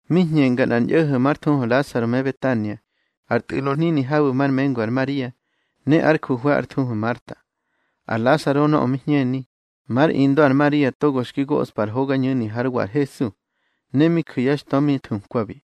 Mi hñenga nꞌar ñꞌo̱ho̱ már thuhu Lasaro me Betania, ar tꞌu̱lo hnini habu̱ mar mengu ar Maria, ne ár juhwe̱ ár thuhu ar Marta. Ar Lasaro nöꞌö mi hñeni, már indö ar Maria, togo xki goꞌspa ar hogañu̱ni hár wa ar Hesu, ne mi ju̱ yá xtö mi thukwabi.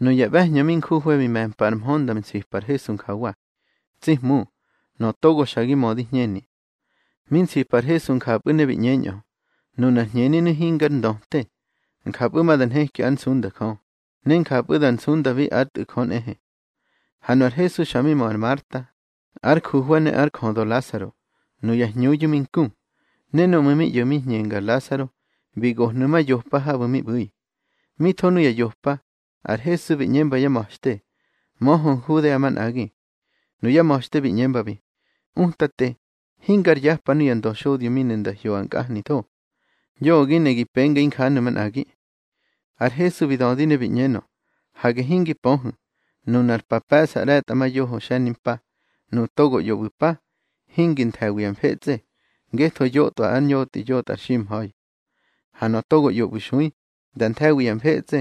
Nuya ꞌbe̱hñö mi njuhwe̱ bi me̱mpa ar mhö nda nsipa ar Hesu njawa: —Tsi Hmu, nöꞌö togo xa gi mödi hñeni. Mi nsipa ar Hesu njapꞌu̱ ne bi ꞌñeñꞌö: —Nunar hñeninu̱ hingar ndöte. Njapꞌu̱ ma da nheki ár nsunda Jö, ne njapꞌu̱ da nsundabi ár Tꞌu̱ Jö nꞌehe. Ha nu ar Hesu xa mi mö ar Marta, ár juhwe̱ ne ár jödö Lasaro, nuya hñuyu̱ mi nku. Ne núꞌmu̱ mi ꞌyo̱ mi hñenga ar Lasaro, bi gohnu̱ ma yopa habu̱ mi ꞌbu̱i. Mi tho nuya yopa, ar Hesu bi ꞌñemba yá ma̱xte: —Möhö Nhudea manꞌagi. Nuyá ma̱xte bi ꞌñembabi: —Utate, hingar yapa nuya ndöxodyo mi ne nda hyoꞌa nkꞌahnitho. Yoꞌö gi ne gi penga injanu̱ manꞌagi. Ar Hesu bi dödi ne bi ꞌñenö: —Hage hingi pöhu̱, nunar pa pe̱ꞌsa ꞌre̱tꞌamayoho xe̱nimpa. Nuꞌu̱ togo ꞌyo ꞌbu̱ mpa, hingi nthe̱wi ya mfetsꞌe, ngetho yotꞌwa ar ñotꞌi yotꞌa ar ximha̱i. Ha nöꞌö togo ꞌyo ꞌbu̱ xui, da nthe̱wi ya mfetsꞌe,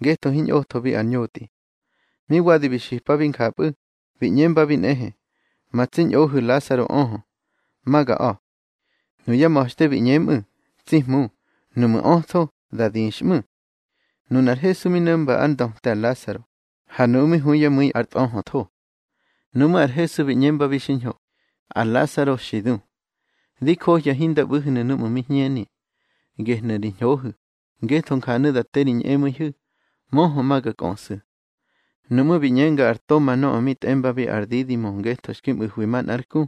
ngetho hiñꞌothobi ar ñotꞌi. Mi wadi bi xipabi njapꞌu̱, bi ꞌñembabi nꞌehe: —Ma tsi ñꞌohu̱ Lasaro öhö. Ma ga a̱. Nuyá ma̱xte bi ꞌñemꞌu̱: —Tsi Hmu, nuꞌmu̱ ötho, da dixꞌmu̱. Nunar Hesu mi no̱mba ár ndöte ar Lasaro, ha nuꞌu̱ mi hu yá mu̱i ar tꞌöhötho. Nuꞌmú̱ ar Hesu bi ꞌñembabi xiñho: —Ar Lasaro xi du. Di johya hinda ꞌbu̱hnu̱ núꞌmu̱ mi hñeni. Gehnu̱ ri ñhohu̱, ngetho njanu̱ da te ri ñꞌemu̱ihu̱. Möhö ma ga kꞌöꞌsu̱. Nuꞌmú̱ bi ꞌñenga ar Toma nöꞌö mi tꞌembabi ar Didimo ngetho xki mꞌu̱hwi manꞌár ku,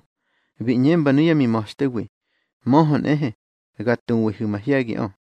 bi ꞌñemba nuyá mima̱xtewi: —Möhö nꞌehe, ga tuwihu̱ mahye̱giꞌö.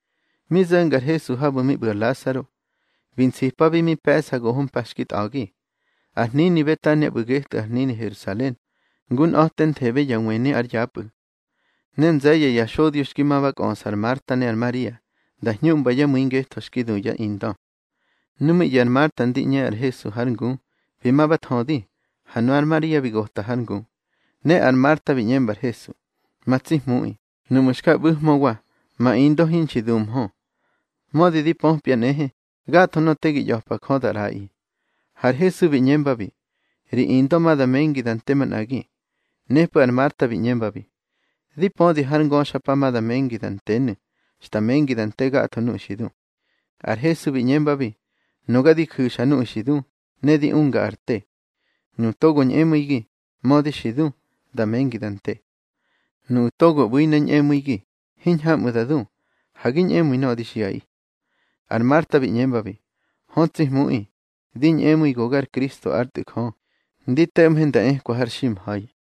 Mi zo̱nga ar Hesu habu̱ mi ꞌbu̱ ar Lasaro, bi nsipabi mi pe̱ꞌsa goho mpa xki tꞌa̱gi. Ar hnini Betania ꞌbu̱ getꞌu̱ ar hnini Herusalen, ngu nꞌa̱tenthebe ya wëni ár yapꞌu̱. Ne nze̱ye̱ ya xodyo xki ma ba kꞌöꞌsa ar Marta ne ar Maria, nda hñuꞌmba yá mu̱i ngetho xki du yá indö. Nu mi ꞌyo̱ ar Marta ndi ꞌñe ar Hesu hár ngu, bi ma ba thödi. Ha nunar Maria bi gota har ngu. Ne ar Marta bi ꞌñemba ar Hesu: —Ma tsi Hmuꞌi, nuꞌmu̱ xka ꞌbu̱hmöwa, ma indö hinxi duhmö. Mödi di pöpya nꞌehe, gatho nöꞌö te gi ꞌya̱pa Jö da ꞌraꞌi. Ha ar Hesu bi ꞌñembabi: —Ri indö ma da mengi da nte manꞌagi. Nepꞌu̱ ar Marta bi ꞌñembabi: —Di pödi, har ngöxpa ma da mengi da ntenu̱, xta mengi da nte gatho nuꞌu̱ xi du. Ar Hesu bi ꞌñembabi: —Nuga di ju̱xa nuꞌu̱ xi du, ne di unga ar te. Nuꞌu̱ togo ñꞌemu̱igi, mödi xi du, da mengi da nte. Nuꞌu̱ togo ꞌbu̱i ne ñꞌemu̱igi, hiñhamꞌu̱ da du. Ha gi ñꞌemu̱i nöꞌö di xiꞌaꞌi. Ar Marta bi ꞌñembabi: —Hö tsi Hmuꞌi, di ñꞌemu̱i go gar Kristo ár Tꞌu̱ Jö, ndi to̱ꞌmhe nda ekwa har ximha̱i.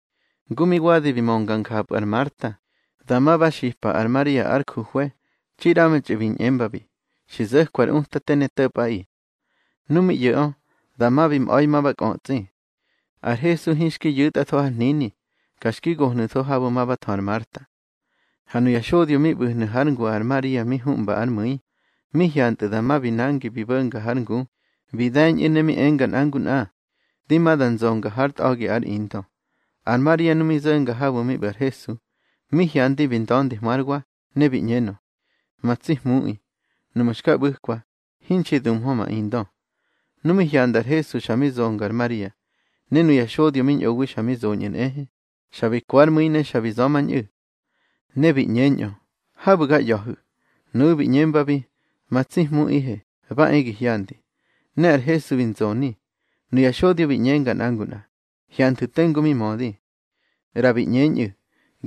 Ngu mi wadi bi mönga njapꞌu̱ ar Marta, dama ba xipa ar Maria ár juhwe̱, txi ꞌramtxꞌu̱ bi ꞌñembabi: —Xi zo̱kwa ar Utate ne to̱pꞌaꞌi. Nu mi ꞌyo̱ꞌö, dama bi mꞌa̱i ma ba kꞌötsꞌi. Ar Hesu hinxki yu̱tꞌatho har hnini, ka xki gohnu̱tho habu̱ ma ba thö ar Marta. Ha nuya xodyo mi ꞌbu̱hnu̱ hár ngu ar Maria mi huꞌmba ár mu̱i, mi hyantꞌu̱ dama bi nangi bi bo̱nga har ngu, bi de̱ñꞌu̱, ne mi enga nꞌa ngu nꞌa: —Di ma da nzonga hár tꞌa̱gi ár indö. Ar Maria nu mi zo̱nga habu̱ mi ꞌbu̱ ar Hesu, mi hyandi bi nda̱ndihmö hár wa, ne bi ꞌñenö: —Ma tsi Hmuꞌi, nuꞌmu̱ xka ꞌbu̱kwa, hinxi duhmö ma indö. Nu mi hyanda ar Hesu xa mi zonga ar Maria, ne nuya xodyo mi ñꞌowi xa mi zoñꞌu̱ nꞌehe, xa bi ko ár mu̱i ne xa bi za̱mañꞌu̱. Ne bi ꞌñeñꞌö: —Habu̱ ga ꞌya̱hu̱. Nuꞌu̱ bi ꞌñembabi: —Ma tsi Hmuꞌihe, ba e gi hyandi. Ne ar Hesu bi nzoni. Nuya xodyo bi ꞌñenga nꞌa ngu nꞌa: —Hyanthu̱ tengu mi mödi. ꞌRa bi ꞌñeñꞌu̱: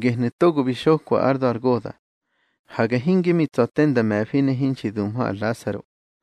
—Gehnu̱ togo bi xokwa ár da̱ ar goda̱. Hage hinge mi tsa̱ te nda me̱fi ne hinxi duhmö ar Lasaro.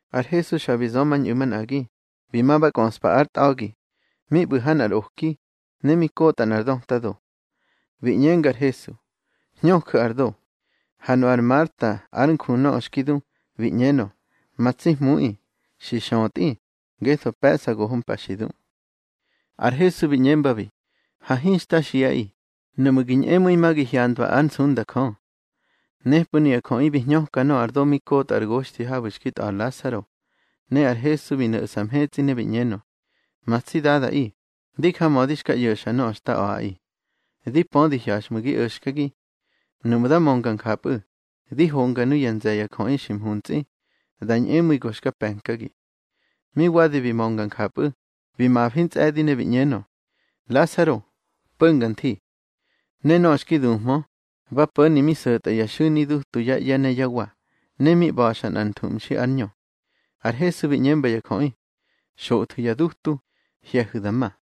Ar Hesu xa bi za̱mañꞌu̱ manꞌagi, bi ma ba kꞌöꞌspa ár tꞌa̱gi, mi ꞌbu̱ ha nꞌar oki, ne mi kota nꞌar döta do. Bi ꞌñenga ar Hesu: —Hñöju̱ ar do. Ha nu ar Marta ár nju nöꞌö xki du, bi ꞌñenö: —Ma tsi Hmuꞌi, xi xötꞌi, ngetho pe̱ꞌsa goho mpa xi du. Ar Hesu bi ꞌñembabi: —Ha hinxta xiꞌi, nuꞌmu̱ gi ñꞌemu̱i ma gi hyandwa ár nsunda Jö. Nepꞌu̱ nuya jöꞌi bi hñöka nöꞌö ar do mi kotꞌa ár goxthi habu̱ xki tꞌa̱ ar Lasaro, ne ar Hesu bi no̱ꞌsa mhetsꞌi ne bi ꞌñenö: —Ma tsi Dadaꞌi, di jamödi xka ꞌyo̱xa nöꞌö xta a̱ꞌaꞌi. Di pödi hyaxꞌmu̱ gi o̱xkagi. Núꞌmu̱ da mönga njapꞌu̱, di honga nuya nze̱ ya jöꞌi xi mhuntsꞌi, da ñꞌemu̱i go xka pe̱nkagi. Mi wadi bi mönga njapꞌu̱, bi mafi ntsꞌe̱di ne bi ꞌñenö: —Lasaro, po̱nga nthi. Ne nöꞌö xki duhmö, ba po̱ni mi so̱tꞌa ya xu̱ni dutu yá ꞌye̱ ne yá wa, ne mi ꞌba̱xa nꞌar nthuꞌmxi ár ñö. Ar Hesu bi ꞌñemba ya jöꞌi: —Xothwu̱ ya dutu, hye̱hu̱ da ma.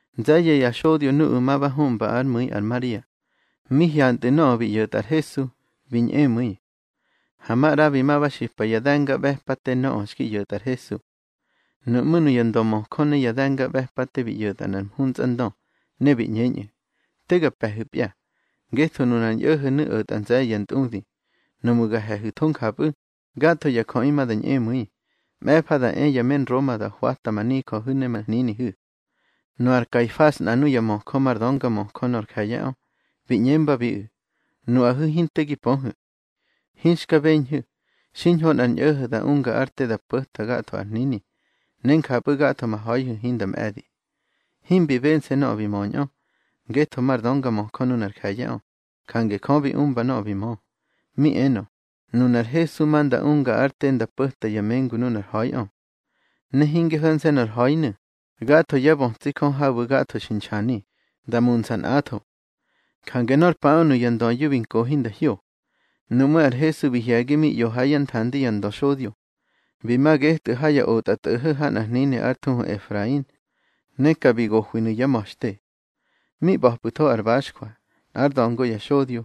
Nze̱ye̱ ya xodyo nuꞌu̱ ma ba huꞌmba ár mu̱i ar Maria, mi hyantꞌu̱ nöꞌö bi ꞌyo̱tꞌa ar Hesu, bi ñꞌemu̱i. Ha maꞌra bi ma ba xipa ya de̱ngaꞌbe̱pate nöꞌö xki ꞌyo̱tꞌa ar Hesu. Nuꞌmú̱ nuya ndömöjö ne ya de̱ngaꞌbe̱pate bi ꞌyo̱tꞌa nꞌar mhuntsꞌandö, ne bi ꞌñeñꞌu̱: —Te ga pe̱hu̱pya. Ngetho nunar ñꞌo̱ho̱nu̱ o̱tꞌa nze̱ye̱ ya ntꞌudi. Nuꞌmu̱ ga he̱hu̱tho njapꞌu̱, gatho ya jöꞌi ma da ñꞌemu̱i. Mꞌe̱fa da e ya me Nroma da hwata ma nijöhu̱ ne ma hninihu̱. Nu ar Kaifas nꞌa nuya möjö mar döngamöjö nor je̱ye̱ꞌö, bi ꞌñembabiꞌu̱: —Nuꞌahu̱ hinte gi pöhu̱. Hinxka beñhu̱, xiñho nꞌar ñꞌo̱ho̱ da unga ár te da po̱ta gatho ar hnini, ne njapꞌu̱ gatho ma ha̱ihu̱ hinda mꞌe̱di. Himbi bense̱ nöꞌö bi möñꞌö. Ngetho mar döngamöjö nunar je̱ye̱ꞌö, jange Jö bi umba nöꞌö bi mö. Mi enö, nunar Hesu ma nda unga ár te nda po̱ta ya mengu nunar ha̱iꞌö. Ne hinge ho̱nse̱ nor ha̱inu̱, gatho yá bötsi Jö habu̱ gatho xi nxani, da muntsꞌa nꞌatho. Jange nor paꞌö nuya ndöyu̱ bi nkohi nda hyo. Nuꞌmú̱ ar Hesu bi hye̱gi mi ꞌyo ha yá nthandi ya ndöxodyo. Bi ma getꞌu̱ ha ya otꞌatꞌo̱ho̱ ha nꞌar hnini ár thuhu Efrain, ne ka bi gohwinu̱ yá ma̱xte. Mi ꞌba̱pꞌu̱tho ar baxjwa, nꞌár da̱ngo ya xodyo.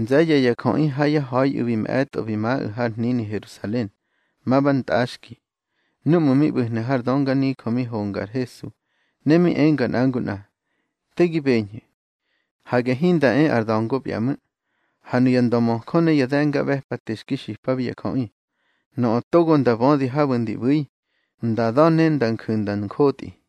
Nze̱ye̱ ya jöꞌi ha yá ha̱iꞌu̱ bi mꞌe̱tꞌo bi maꞌu̱ har hnini Herusalen, ma ba ntꞌaxki. Núꞌmu̱ mi ꞌbu̱hnu̱ har dönganijö mi honga ar Hesu, ne mi enga nꞌa ngu nꞌa: —Te gi beñhu̱. Hage hinda e ar da̱ngopya ꞌmu̱. Ha nuya ndömöjö ne ya de̱ngaꞌbe̱pate xki xipabi ya jöꞌi, nöꞌö togo nda bödi habu̱ ndi ꞌbu̱i, nda da̱ ne nda nju̱ nda njotꞌi.